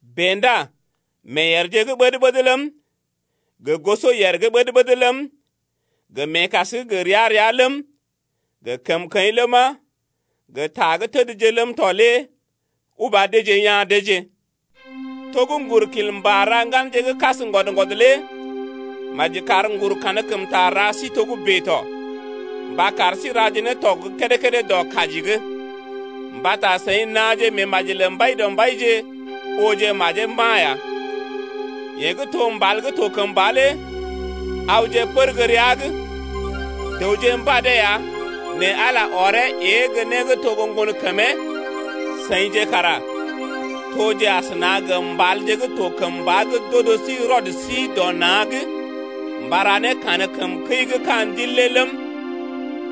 Bèe ndá meeyèrje gə́ ɓəd-ɓəd ləm, gə gosɔyèr gə́ ɓəd-ɓəd ləm, gə meekas gə́ ria-ria ləm, gə kəmkəḭ ləma, gə ta gə́ tədje ləm tɔ lé uba deeje ya̰ deeje. To gə́ ŋgur kil mbà ra ŋganje gə́ kas ŋgwɔd-ŋgwɔd lé maji kar ŋgur kankəmta ra sí togə́bè tɔ, mba kar sí raje ne tɔg gə́ kédé-kédé dɔ kaji’g, mbata seḭ naaje meemaji lə Mbaidɔmbaije, ooje majee mba̰ ya. Yeḛ gə́ to mbal gə́ to kəmba lé awje pər gə́ rəa’g, dəwje mbadee ya nɛ Ala ɔree ée gə́ né gə́ to gə́ ŋgonkəmee. Seḭje kara toje asəna gə mbalje gə́ to kəmba gə́ d’odo sí rɔd sí dɔ na̰’g mba ra ne kankəm kəi gə́ ka̰ Ndil lé ləm,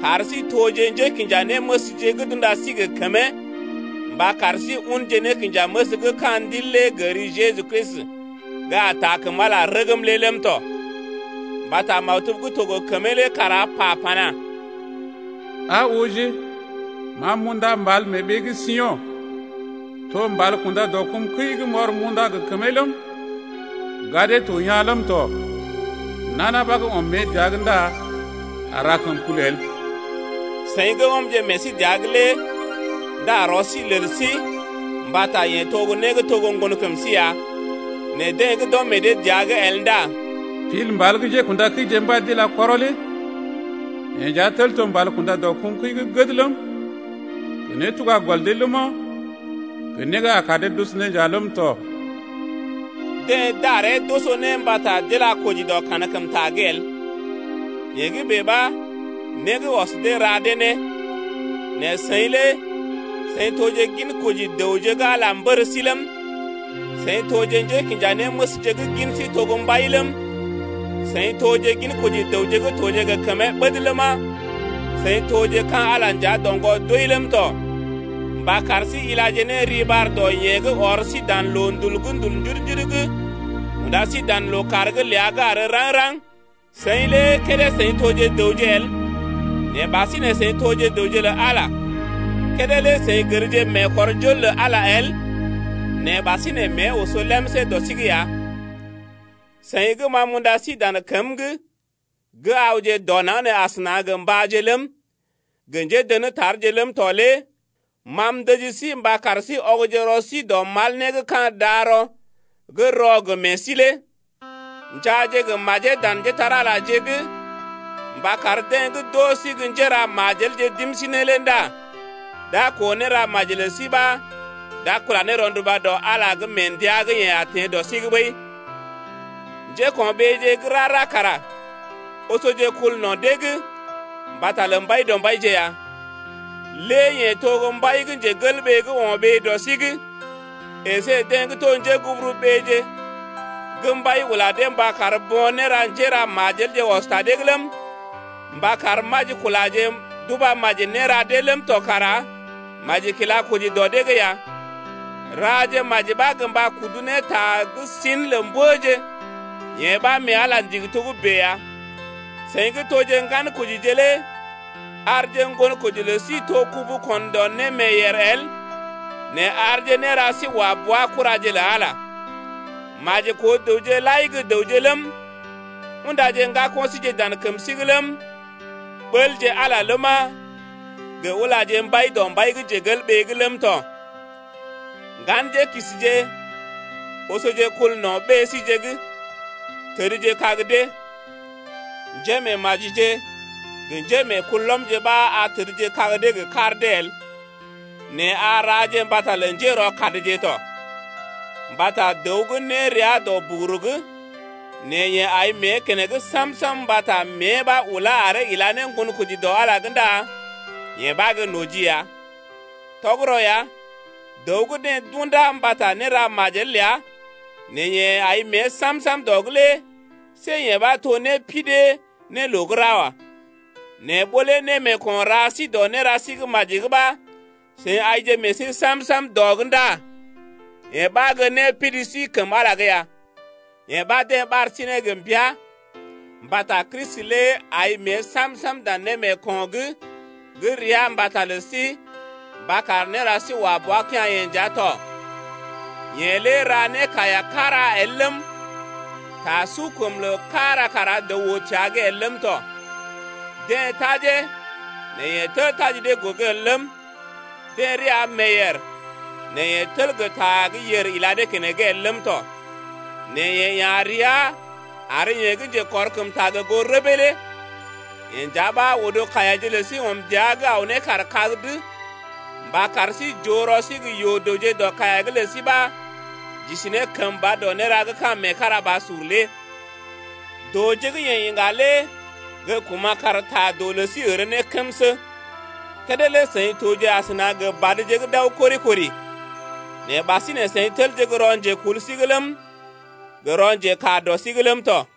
kar sí toje njékinjanéməsje gə́ d’unda sí gə kəmee mba kar sí unje nékinjaməs gə́ ka̰ ndil lé gə ri Jeju Kristi gə́ a taa kəm Ala rəgm lé ləm tɔ. Mbata maktub gə́ to gə kəmee lé kara pa pana: Aa ooje, ma m’unda mbal mee ɓee gə́ Sio̰, To mbal kunda dɔ kum kəi m’ɔr m’unda gə kəmee ləm, Gadee to yaa̰ ləm tɔ. Nana ɓa gə́ ɔm mée dəa’g ndá a ra kəmkul el. Seḭ gə́ ɔmje meḛ sí dəa’g lé ndá rɔ sí lel sí mbata yeḛ to gə́ né gə́ to gə́ ŋgonkəm sí ya. Nɛ deḛ gə́ d’ɔm meḛ dee dəa’g el ndá Pil mbal gə́ njékṵdakəije mbad d’ila kɔrɔ lé Yee nja tel to mbal kunda dɔ kum kəi gə́ gəd ləm, Gə nétuga gɔl dee ləma, Gə né gə́ a kar dee d’oso ne nja ləm tɔ. Deḛ daree, d’oso ne mbata d’ila koji dɔ kankəmta’g el, yee gə́ bèe ɓa né gə́ ɔs dee ra dee ne. Nɛ seḭ lé seḭ toje ginkoji dəwje gə́ Ala mbər sí ləm, seḭje toje njékinjanéməsje gə́ gin sí to gə́ mbai ləm, seḭ toje ginkoji dəwje gə́ toje gə kəmee ɓəd ləma, seḭ toje ka̰ Ala nja doŋgɔ doi ləm tɔ mba kar sí ilaje ne riɓar dɔ yeḛ gə́ ɔr sí dan loondul gə́ ndul njudu-njudu’g unda sí dan lookàr’g ləa gə́ àr raŋg-raŋg lé. Seḭ lé kédé seḭ toje dəwje el, nɛ ɓasinè seḭ toje dəwje lə Ala lé. Kédé lé seḭ gərje meekɔrjol lə Ala el nɛ ɓasinè mée oso lemsé dɔ sí’g ya. Seḭ gə́ ma m’unda sí dan kəm’g gə́ awje dɔ naŋg nee asəna gə mbáje ləm, gə njédə̰tarje ləm tɔ lé ma m’ndəji sí mba kar sí ɔgje rɔ sí dɔ mal né gə́ ka̰ darɔ gə́ rɔ gə meḛ sí lé. Njaaje gə́ majee dan njépole-magəje’g mba kar deḛ gə́ d’oo sí gə́ njéra majelje d’im sí ne lé ndá d’a koo néra maji lə sí ɓa d’a kula ne rɔnduba dɔ Ala’g mee ndəa gə́ yeḛ a teḛ dɔ sí’g ɓəi. Njéko̰ɓeeje gə́ rara kara osoje kul no̰ dee’g mbata lə Mbaidɔmbaije ya, lé yeḛ to mbai gə́ o̰ ɓee dɔ sí’g əsé deḛ to njéguburuɓeeje gə́ mbai ula dee mba kar bo̰ néra njéra majelje ɔs ta dee’g ləm, mba kar majikulaje d’uba maji néra dee ləm tɔ kara maji kila koji dɔ dee’g ya. Raje maji ɓa gə mba kudu ne ta gə́ sin lə mbəje, yee ɓa mee Ala ndigi togə́bè ya. Seḭ gə́ toje ŋgankojije lé arje ŋgonkoji lə sí to kubu kon dɔ némeeyèr el nɛ arje néra sí wa bua kuraje lə Ala ya. Maji koo dəwje lai gə́ dəwje ləm, undaje ŋgako̰ síje dan kəm sí’g ləm, ɓəlje Ala ləma, gə ulaje mbai dɔ mbai’g ləm tɔ. Ŋganjélookisije, osoje kul no̰ ɓée síje’g, tədjekag dee, njémeemajije gə njémeekulɔmje ɓa a tədjekag dee gə kar dee el, nɛ a raje mbata lə njérɔkadje tɔ. Mbata dəw gə́ né rəa dɔ buguru’g, nɛ yeḛ ai mée keneŋ sam-sam mbata mée ɓa ulá aree ila ne ŋgonkoji dɔ Ala’g lé ndá yee ɓa gə́ noji ya. Tɔgərɔ ya, dəw gə́ deḛ d’undá mbata néra majel ləa nɛ yeḛ ai mée sam-sam dɔ’g lé see yee ɓa to népidee ne loo gə́ ra wa. Nɛ ɓó lé némeeko̰ ra sí dɔ néra sí gə́ maji’g ɓa seḭ aije meḛ sí sam-sam dɔ’g ndá yee ɓa gə́ népidi sí kəm Ala’g ya. Yee ɓa deḛ ɓar sí ne gə mbəa mbata Kristi lé ai mée sam-sam dan némeeko̰’g gə́ rəa mbata lə sí mba kar néra sí wa bua kea̰-yeḛ nja tɔ. Yeḛ lé ra nékaiya kára el ləm, ta sukəmloo kára kara dəw oo təa’g el ləm tɔ. Deḛ tajee nɛ yeḛ tel taji dee gogo el ləm, deḛ rəa meeyèr nɛ yeḛ tel gə́ ta gə́ yèr ila dee keneŋ el ləm tɔ. Nɛ yeḛ ya̰ rəa ar yeḛ gə́ njekɔrkəmta gə goo rəbee lé. Yeḛ nja ɓa odo kaiyaje lə sí ɔm dəa’g aw ne kaar kag’d mba kar sí j’oo rɔ sí gə́ yoo-dəwje dɔ kaiya’g lə sí ɓa j’isi ne kəmba dɔ néra gə́ ka̰ meekarabasur lé. Dooje gə́ yeḛ iŋga lé gə́ kuma̰ kar ta doo lə sí ər ne kəmsə. Kédé lé seḭ toje asəna gə badje gə́ d’aw kori-kori bèe, nɛ ɓasinè seḭ telje gə́ rɔ njekul sí’g ləm, gə rɔ njekaa dɔ sí’g ləm tɔ.